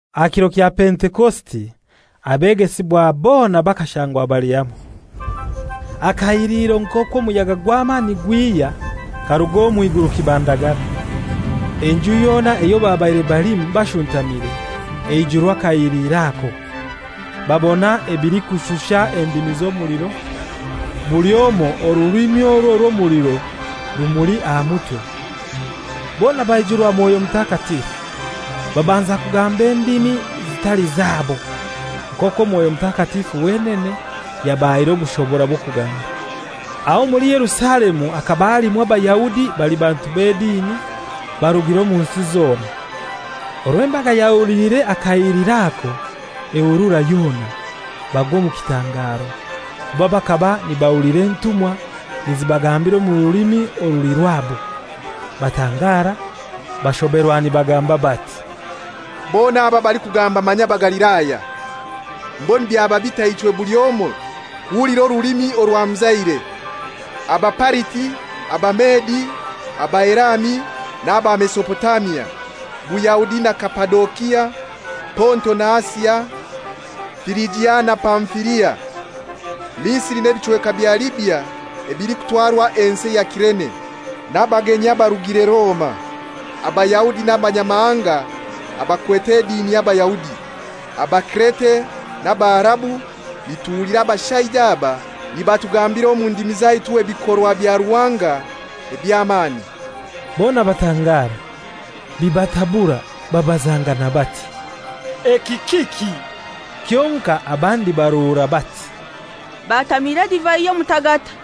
Aha kiro kya Pentekosite, abegesibwa bona bakashangwa bali hamoi. Akahiliro nk'okw'omuyaga gw'amani karuga omw'iguru kibandagara, enju yona eyo babaire balimu bashuntamire eijurwa akahiliro ako. Babona ebilikushusha endimi z'omuliro, buli omoi orulimi orwo rw'omuliro rumuli aha mutwe. Bona baijurwa Mwoyo Mutakatifu, babanza kugamba endimi zitali zabo, nk'okwo Mwoyo Mutakatifu wenene yabahaire obushobora bw'okugamba. Aho omuli Yerusalemu hakaba halimu Abayahudi bali bantu b'edini, barugire omu nsi zona. Orwo embaga yahuliire akahiliro ako ehurura yona, bagwa omu kitangaro, kuba bakaba nibahulira entumwa nizibagambira omu rulimi oruli rwabo. Batangara, bashoberwa nibagamba bati, «Bona aba abalikugamba manya Bagalilaya! Mbwenu byaba bitai ichwe buli omoi kuhulira orulimi orwamuzaire? Abapariti, Abamedi, Abaelami n'aba Mesopotamia, Buyahudi na Kapadokia, Ponto na Asia, Firijia na Pamfilia, Misiri n'ebichweka bya Libya ebilikutwarwa ensi ya Kirene, n'abagenyi abarugire Roma, Abayahudi n'Abanyamahanga abakwete edini y'Abayahudi, Abakirete n'Abaarabu, nituhulira abashaija aba nibatugambira omu ndimi zaitu ebikorwa bya Ruhanga eby'amani!» Bona batangara, bibatabura, babazangana bati, «Eki kiki?» Kyonkai abandi baruura, bati, «Batamiira edivai y'omutagata.»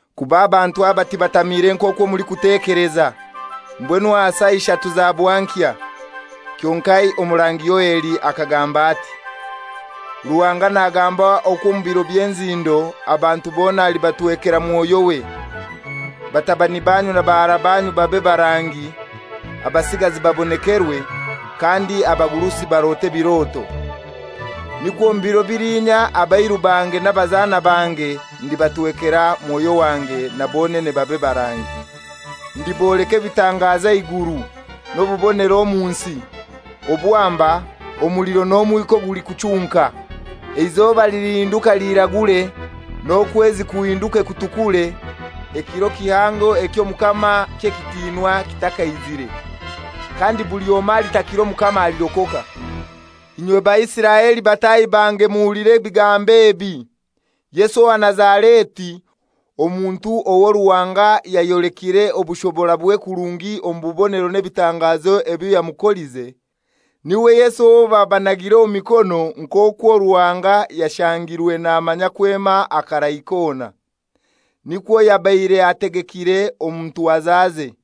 Kuba abantu aba tibatamiire nk'okwo mulikutekeleza. Mbwenu aha saa ishatu za bwankya. Kyonkai Omurangi Yoeli akagamba ati, ‹Ruhanga nagamba okwo omu biro by'enzindo, abantu bona alibatwekera Mwoyo we. Batabani banyu na bahara banyu babe barangi, abasigazi babonekerwe, kandi abagurusi barote ebiroto. Nikwo omu biro bilinya abairu bange n'abazana bange ndibatwekera Mwoyo wange, na bonene babe barangi. Ndiboleka ebitangazo aha iguru, n'obubonero omu nsi; obwamba, omuliro n'omwika ogulikuchunka. Eizoba lilihinduka liiragure, n'okwezi kuhinduke kutukure, ekiro kihango eky'Omukama ky'ekitinwa kitakaizire. Kandi buli omoi alitakira Omukama alirokoka.› «Inywe Baisiraeli bataahi bange muhulire ebigambo ebi: Yesu owa Nazareti, omuntu owo Ruhanga yayolekire obushoborabwe kurungi omu bubonero n'ebitangazo ebyo yamukolize, n'iwe Yesu owo babanagire omu mikono nk'okwo Ruhanga yashangirwe namanya kwema akarai kona, nikwo yabaire ategekire omu ntwazaze.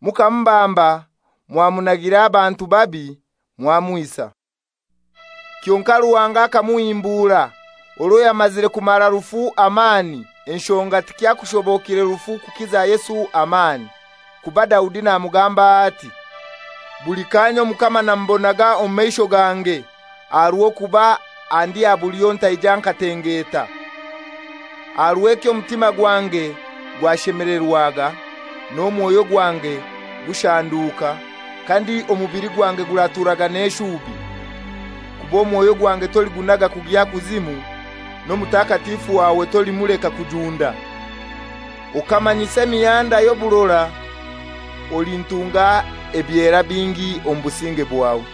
Mukamubamba, mwamunagira abantu babi, mwamwisa. Kyonkai Ruhanga akamuhimbura, orwo yamazire kumara rufu amani, enshonga tikyakushobokire rufu kukiza Yesu amani. Kuba Daudi namugambaho ati, ‹Buli kaanya Omukama namubonaga omu maisho gange, aha rw'okuba andi aha bulyo ntaija nkatengeta. Aha rw'ekyo omutima gwange gwashemelerwaga, n'omwoyo gwange gushanduuka; kandi omubili gwange guraturaga n'eshubi. Kuba omwoyo gwange toligunaga kugya Kuzimu, n'Omutakatifu wawe tolimuleka kujunda. Okamanyisa emihanda y'oburora; olintunga ebyera bingi omu businge bwawe.›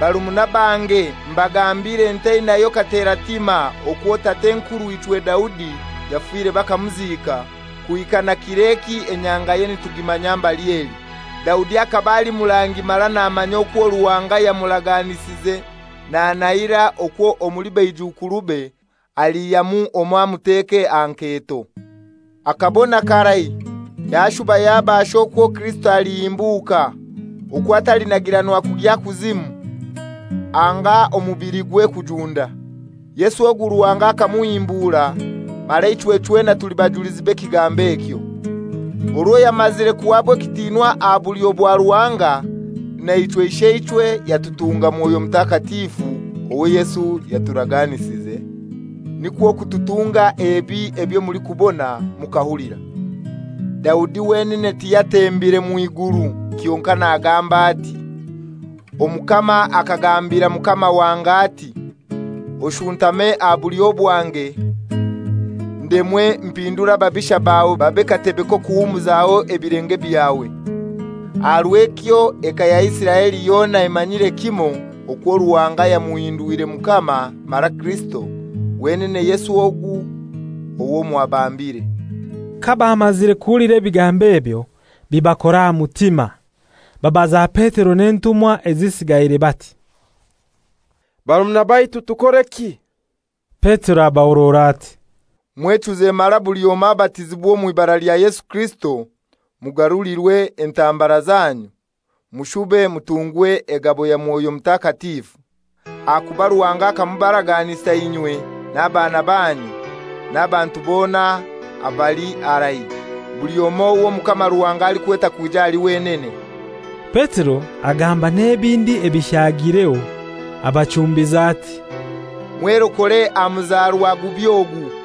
«Barumuna bange, mbagambire ntainayo kateratima okwo tat'enkurw'ichwe Daudi yafire bakamuziika, kuhika na kir'eki enyangaye nitugimanya mbali eli. Daudi akaba ali murangi mara namanya okwo Ruhanga yamuraganisize nanahira okwo omuli baijukurube aliihyamu omoi amuteke aha nketo. Akabona karai, yashuba yabasha okwo Kirisito alihimbuka, okwo atalinagiranwa kugya Kuzimu, anga omubiligwe kujunda. Yesu ogu Ruhanga akamuhimbura, mara ichwe chwena tuli bajulizi b'ekigambo ekyo. Orwo yamazire kuhaba ekitinwa aha bulyo bwa Ruhanga, naichwe Isheichwe yatutunga Mwoyo Mutakatifu owo Yesu yaturaganisize, nikwo kututunga ebi ebyo mulikubona mukahulira. Daudi wenene tiyatembire mw'iguru; kyonkai nagamba ati, ‹Omukama akagambira Mukama wange ati: Oshuntame aha bulyo bwange, ndemwe mpindure ababisha bawe babe katebe k'okuhumuzaho ebilenge byawe.› Aha rw'ekyo eka ya Isiraeli yona emanyiire kimoi okwo Ruhanga yamuhindwire Mukama mara Kirisito, wenene Yesu ogu owo mwabambire.» Kabamazire kuhulira ebigambo ebyo bibakora aha mutima, babaza Petero n'entumwa ezisigaire bati, «Barumuna baitu, tukoreki?» Petero abahorora ati, «Mwechuze mara buli omoi abatizibwe omw'ibara lya Yesu Kirisito, mugarulirwe entambara zanyu; mushube mutungwe egabo ya Mwoyo Mutakatifu. Ahakuba Ruhanga akamubaraganisa inywe n'abaana banyu, n'abantu bona abali harai; buli omoi ow'Omukama Ruhanga alikweta kwija ahali wenene.» Petero agamba n'ebindi ebishagireho, abachumbiza ati, «Mwerokore aha muzarwa gubi ogu.»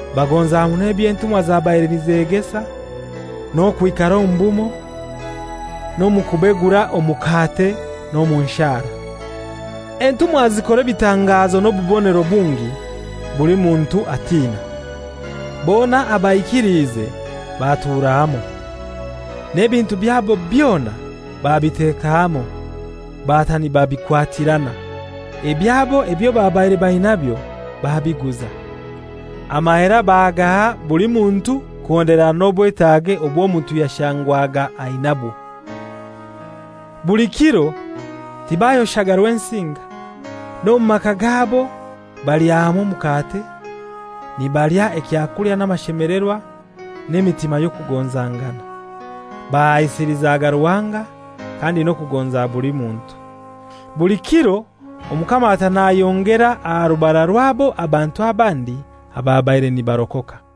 Bagonza muno eby'entumwa zabaire nizegesa, n'okwikara omu bumoi, n'omu kubegura omukate n'omu nshara. Entumwa zikora ebitangazo n'obubonero bungi, buli muntu atina. Bona abaikiliize batura hamoi, n'ebintu byabo byona babiteka hamoi, bata nibabikwatirana. Ebyabo ebyo babaire bainabyo babiguza, amahera bagaha buli muntu kuhonderana n'obwetaage obw'omuntu yashangwaga ainabwo. Buli kiro tibayoshaga Rwensinga, n'omu maka gabo balya hamoi omukate, nibalya ekyakulya n'amashemelerwa n'emitima y'okugonzangana. Bahaisilizaga Ruhanga kandi n'okugonza buli muntu. Buli kiro Omukama ata nayongera aha rubara rwabo abantu abandi ababaire nibarokoka.